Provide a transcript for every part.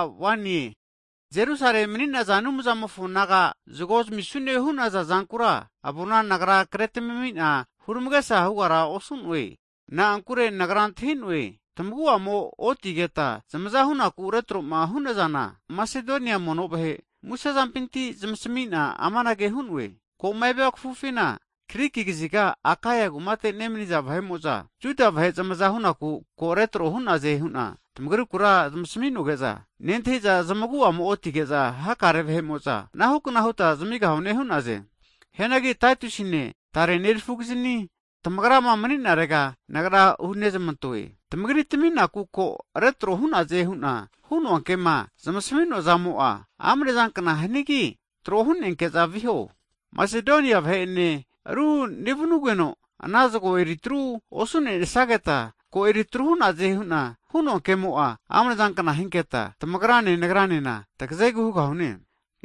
Hagi Jerusalemi mani'naza Anumzamofo nagama zagoma zamisune hu'naza zankura avona nagra kretamimi'na huramagesa hugara osu'noe. Na'ankure nagra antahi'noe, tamagu'amo otigeta zamaza hunaku retro'ma hu'nazana, Masedonia mono vahe, musezampinti zamasami'na amanage huno'e, ko'ma evia kafufina Griki kaziga Akaia kumate nemaniza vahe'mo'za, Juda vahe zamaza hu'naku ko retro hu'naze hu'na tamagriku zamasmi'noge'za, nentahiza zmagu'amo otige'za hakare vahe'mo'za anahukna huta zamigahune hu'naze. Hianagi Taitusine tare nerafukiznia tamagrama mani'narega nagra hunezmantoe. Tamagri tami'naku ko retro hu'naze hu'na hu'noa kema zamasami'noa zamo'a, amnezankna hanigi, tro hu'nenke'za viho. Masedonia vahe'ene ru nevnugeno, ana zagoma eri tru osu'nesageta, ko eritru hu'naze hu'nama hu'noa ke'mo'a, amnezankna hinketa, tamagrane nagranena tagazegu hugahune.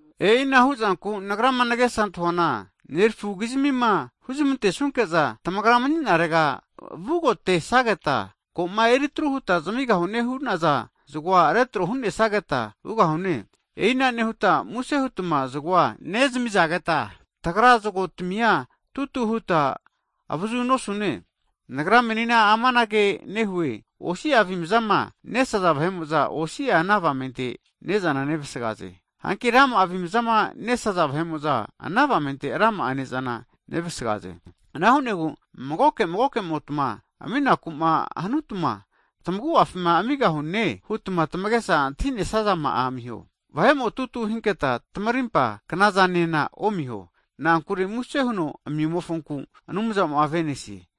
E'ina hu'zanku nagrama nagesa antahuana nerafukizmima huzmantesunke'za tamagrama mani'narega vugotesageta, ko'ma eritru huta zamigahune hu'naza zagoa retro hu'nesageta vugahune. E'ina nehuta muse hutma zagoa nezaminageta, tagra zagotamia tutu huta avazu osugahune. Nagra menina amanage nehue, osi'a avimzama nesaza vahe'mo'za, osi'a ana avamente ne'zana nevasgaze. Hanki rama'a avimaza nesaza vahe'mo'za, ana avamente rama'a ne'zana nevasgaze. Ana hu'negu magoke magokemotma aminaku'ma hanutma, tamagu'afima amigahune hutma tamagesa antahinesazama'a amiho. Vahe'mo tutu hinketa tamarimpa knazanena omiho. Na'ankure muse huno ami'mofonku, Anumzamo'a avenesie.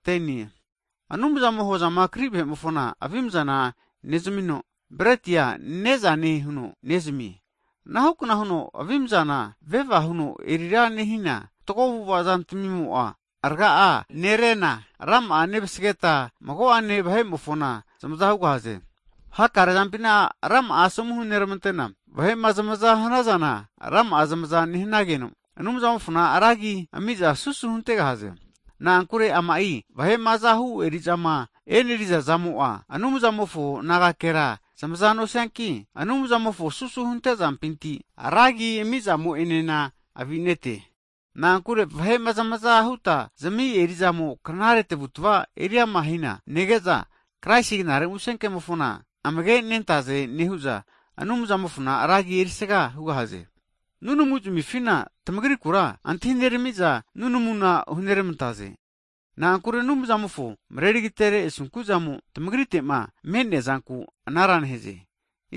Hagi Anumzamo'a hozama kri vahe'mofona avimzana nezamino, bretia ne'zane huno nezamie. Anahukna huno avimzana veva huno erira nehina, fatgo avu'ava zantamimo'a raga'a nerena, rama'a nevasageta mago'ane vahe'mofona zamaza hugahaze. Hakare zampina rama'a asomu hunermantena, vahe'ma zamaza hanazana kankamumpinti rama'a zamaza nehanageno, Anumzamofona ra agi ami'za susu huntegahaze. Na'ankure ama'i vahe'ma azahu eri'zama e'neriza zamo'a, Anumzamofo nagakera zamaza nosianki, Anumzamofo susu huntezampinti, ra agi amizamo'enena avinete. Na'ankure vahe'ma zamaza huta knazami eri'zamo, knare tamavutava eriama hina nege'za, Kraisi Knare Musenkemofona amagenentaze hu'za huama nehu'za, Anumzamofona ra agi erisaga hugahaze. Nunamuzamifina tamagrikura antahineramiza nunamuna hunermantaze. Na'ankure Anumzamofo mareri agatere asunku'zamo tamagrite'ma me'neazanku anara nehaze.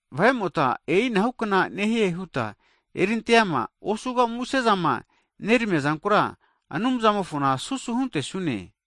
Vahe'mota e'inahu kna nehie huta erinteama osuga muse zama neramiazankura, Anumzamofona susu huntesune.